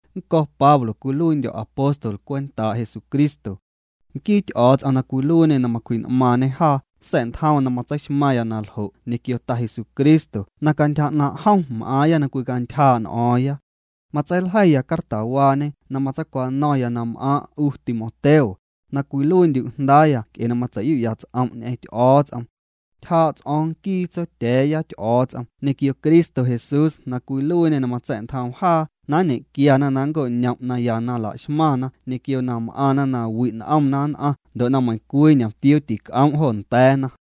Nnco̱ Pablo cwiluiindyo̱ apóstol cwentaa' Jesucristo. Nquii Ty'o̱o̱ts'om na cwiluiiñê na macwji'n'maaⁿñê jaa sa̱'ntjoom na matseixmaⁿya na ljo' ñequio Ta Jesucristo na cantyja 'naaⁿ' jom m'aaⁿya na cwicantyjaa' n'o̱o̱ⁿya. Matseiljeiya cartawaañe na matseicwano̱ⁿya na m'aaⁿ' 'u Timoteo, na cwiluiindyu' jndaaya nc'e na matseiyu'ya ts'om' ñ'eⁿ Ty'o̱o̱ts'om. Ntyjaa' ts'o̱o̱ⁿ nquii Tsotya̱a̱ya Ty'o̱o̱ts'om ñequio Cristo Jesús na cwiluiiñê na matsa̱'ntjoom jaa na ñequiana na nnco'ñom' naya na la'xmaⁿna ñequio na m'aⁿna nawi' n'omna nn'aⁿ ndo' na meiⁿcwii ñomtiuu tinc'oom' jo nda̱a̱na.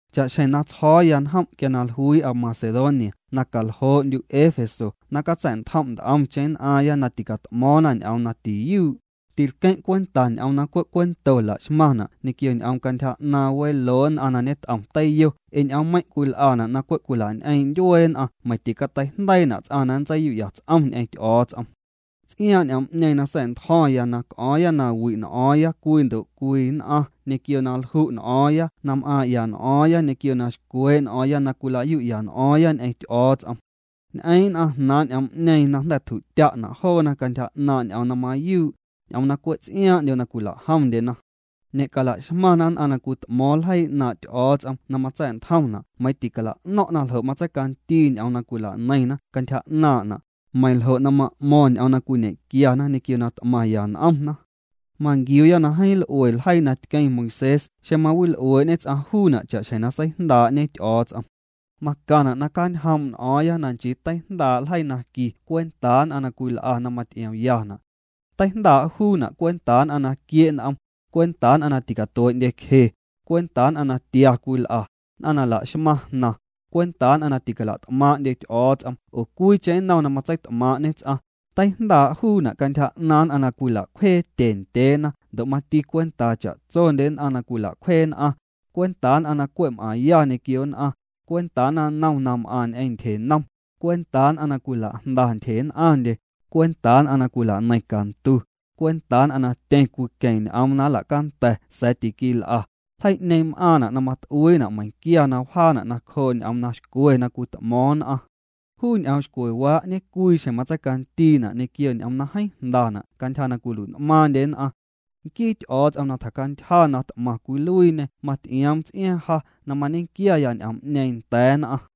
Cha'xjeⁿ na tsjo̱o̱ya njom' quia na jluii'a Macedonia na caljoo'ndyu' Éfeso na catsa̱'ntjom' nt'omcheⁿ nn'aⁿ na ticat'mo̱o̱ⁿna ñ'oom na tiyuu', tilqueⁿ' cwenta ñ'oom na cwe' cuento laxmaⁿna' ñequio ñ'oom cantyja 'naaⁿ weloo nn'aⁿ na ñet'om teiyo ee ñ'oommeiⁿ' cwil'ana' na cwe' cwila'ñ'eeⁿ' ndyuee nn'aⁿ meiⁿ ticateijndeiina' ts'aⁿ na nntseiyu'ya ts'om ñ'eⁿ Ty'o̱o̱ts'om. Ts'iaaⁿ' ñ'oom'ñeeⁿ na sa̱'ntjo̱ⁿya na c'o̱o̱ⁿya na wi' n'o̱o̱ⁿya cwii ndo' cwii nn'aⁿ ñequio na lju' n'o̱o̱ⁿya na m'aaⁿ'ya n'o̱o̱ⁿya ñequio na xcwee' n'o̱o̱ⁿya na cwila'yu'ya n'o̱o̱ⁿya ñ'eⁿ Ty'o̱o̱ts'om. Ñ'eeⁿ nn'aⁿ jnaaⁿ' ñ'oom'ñeeⁿ na jnda̱ tju'tya'na' joona cantyja 'naaⁿ' ñ'oom na mayuu', ñ'oom na cwe' ts'iaaⁿ'ndyo cwila'jomndyena. Ñe'calaxmaⁿna nn'aⁿ na cwit'mo̱o̱ⁿ ljeii 'naaⁿ' Ty'o̱o̱ts'om na matsa̱'ntjomna' meiiⁿ ticala'no̱ⁿna ljo' tseicandii ñ'oom na cwila'neiⁿna cantyja 'naaⁿ'na', meiⁿ ljo' na ma'mo̱ⁿ ñ'oom na cwiñequiana ñequio na t'maⁿya n'omna. Manquiuuya na jeeⁿ l'ue ljeii na tqueⁿ Moisés xeⁿ mawil'uee'ñe ts'aⁿ juuna' cha'xjeⁿ na seijndaa'ñe Ty'o̱o̱ts'om. Macaⁿna' na cjaanjoom' n'o̱o̱ⁿya na nchii teijndaa' ljeii na qui cwentaa nn'aⁿ na cwil'a na maty'iomyana'. Teijndaa' juuna' cwentaa nn'aⁿ na quie' n'om, cwentaa nn'aⁿ na ticatuee'ndyecje, cwentaa nn'aⁿ na tia cwil'a, nn'aⁿ na laxmaⁿ jnaⁿ, cwentaa nn'aⁿ na ticala't'maaⁿ'ndye Ty'o̱o̱ts'om oo cwiicheⁿ nnom na matseit'maaⁿ'ñe ts'aⁿ, teijndaa' juuna' cantyja 'naaⁿ nn'aⁿ na cwila'cwjee tye ndyeena ndo' mati cwentaa cha'tsondye nn'a na cwila'cwjee nn'aⁿ, cwentaa nn'aⁿ na cwe' m'aⁿya ñequio nn'aⁿ, cwentaa naⁿnom na m'aⁿ ñequio tyjenom, cwentaa nn'aⁿ na cwila'jnda ntyje nn'aⁿndyena, cwentaa nn'aⁿ na cwilaneiⁿ cantu, cwentaa nn'aⁿ na tyeⁿ cwiqueⁿ ñ'oom na nlacanda̱ sa̱a̱ tiquil'a, ljeii'ñeeⁿ m'aⁿna' na mat'uiina' meiⁿquia na wjaana' nacjoo' ñ'oom na xcwe na cwit'mo̱o̱ⁿ nn'aⁿ. Juu ñ'oom xcwewaa' ñecwii xjeⁿ matseicandiina' ñequio ñ'oom na jeeⁿ jnda'na' cantyja na cwilui'n'maaⁿndye nn'aⁿ. Nquii Ty'o̱o̱ts'om na tjacantyja na t'maⁿ cwiluiiñê maty'ioom ts'iaaⁿ ja na mañequiaya ñ'oom'ñeeⁿ nda̱a̱ nn'aⁿ.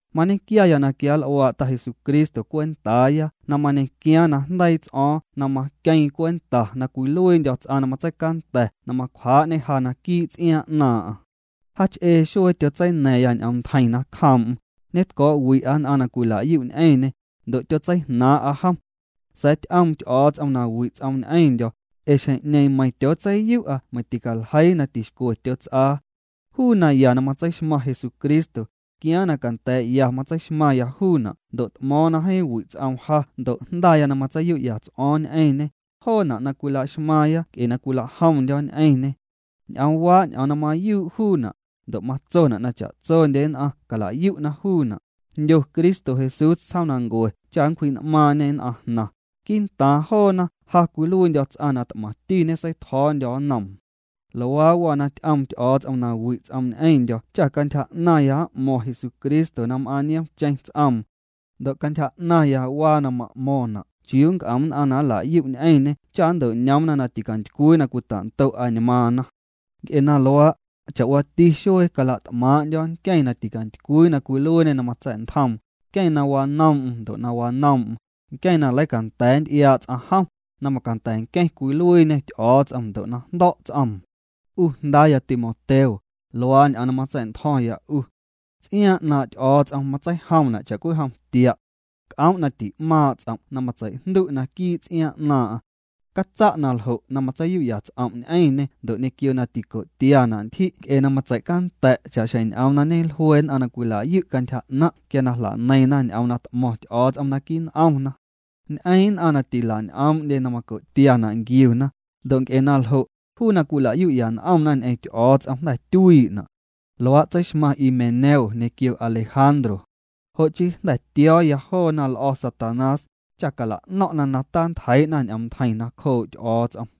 Mañequiaya na quianl'uaa' Ta Jesucristo cwentaaya na mañequiaaⁿ najndeii' ts'o̱o̱ⁿ na maqueeⁿ cwenta na cwiluiindyo̱ ts'aⁿ na matseicanda̱ na macwjaa'ñê ja naquii' ts'iaaⁿ 'naaⁿ'aⁿ. Jaach'ee xuee tyotseina̱ⁿya ñ'oom ntjeiⁿ nacjoom'm, ñetco̱'wi'a nn'aⁿ na cwila'yu' ñ'eⁿñê, ndo' tyotseijnaaⁿ'a jom. Sa̱a̱ ty'oom Ty'o̱o̱ts'om na wi' ts'oom ñ'eⁿndyo̱, ee xjeⁿ'ñeeⁿ meiⁿ tyootseiyu'a meiⁿ tîcaljeii na tixcwe tyots'aa. Juu naya na matseixmaⁿ Jesucristo, tquiaaⁿ na canda̱a̱'ya matseixmaⁿya juuna' ndo' t'mo̱o̱ⁿ na jeeⁿ wi' ts'oom ja ndo' jndaya na matseiyu'ya ts'o̱o̱ⁿ ñ'eⁿñê, joona' na cwila'xmaaⁿya nc'e na cwila'jomndyo̱ ñ'eⁿñê. Ñ'oomwaa ñ'oom na mayuu' juuna', ndo' matsona' na cha'tsondye nn'aⁿ cala'yu'na juuna': jndyo Cristo Jesús tsjoomnancue cha nncwji'n'maaⁿ'ñê nn'aⁿ jnaⁿ, quii'ntaaⁿ joona ja cwiluiindyo̱ ts'aⁿ na t'maⁿti ñeseitjo̱o̱ndyo̱ nnoom. Luaa waa na ty'oom Ty'o̱o̱ts'om na wi' ts'oom ñ'eⁿndyo̱ cha cantyja 'naⁿya m'mo̱ⁿ Jesucristo na m'aaⁿ na nioom'cheⁿ ts'oom. Ndo' cantyja 'naaⁿya waa na ma'mo̱ⁿna' chiuu nc'om nn'aⁿ na nla'yu' ñ'eⁿñê cha nnto'ñoomna na ticantycwii na cwita'ndo' añmaaⁿna. Nc'e na luaa', cha'waati xuee cala't'maaⁿ'ndyo̱ nqueⁿ na ticantycwii na cwiluiiñê na matsa̱'ntjoom, nqueⁿ na wanoom'm ndo' na wanoom'm, nqueⁿ na leicanda̱a̱ nty'iaa ts'aⁿ jom, na macanda̱ nqueⁿ cwiluiiñê Ty'o̱o̱ts'om ndo' na jndo̱' ts'oom. 'U jndaaya Timoteo, luaa ñ'oom na matsa̱'ntjo̱ⁿya 'u. Ts'iaaⁿ 'naaⁿ' Ty'o̱o̱ts'om matseijomna' cha'cwijom tia'. C'oom' na ti'maaⁿ' ts'om' na matseijndu' naquii' ts'iaaⁿ 'naaⁿ'aⁿ. Catsa' na ljo' na matseiyu'ya' ts'om' ñ'eⁿñê ndo' ñequio na tico'tiana' ntyji' nc'e na matseicanda̱' cha'xjeⁿ ñ'oom na ñejlue nn'aⁿ na cwila'yu' cantyja 'naⁿ' quia na jla'neiⁿna ñ'oom na t'mo̱ⁿ Ty'o̱o̱ts'om naquii' n'omna. Ñ'eeⁿ' nn'aⁿ na tila'ñ'oomndye na maco'tiana' nquiuna, ndo' nc'e na ljo', juu na cwila'yu'ya n'omna ñ'eⁿ Ty'o̱o̱ts'om, jnda̱ tyuii'na'. Luaa' tseixmaⁿ Himeneo ñequio Alejandro. Jo' chii jnda̱ tio̱o̱ya joona l'o̱ Satanás, cha cala'no̱ⁿ'na na tantjeii'na ñ'oom ntjeiⁿ nacjoo' Ty'o̱o̱ts'om.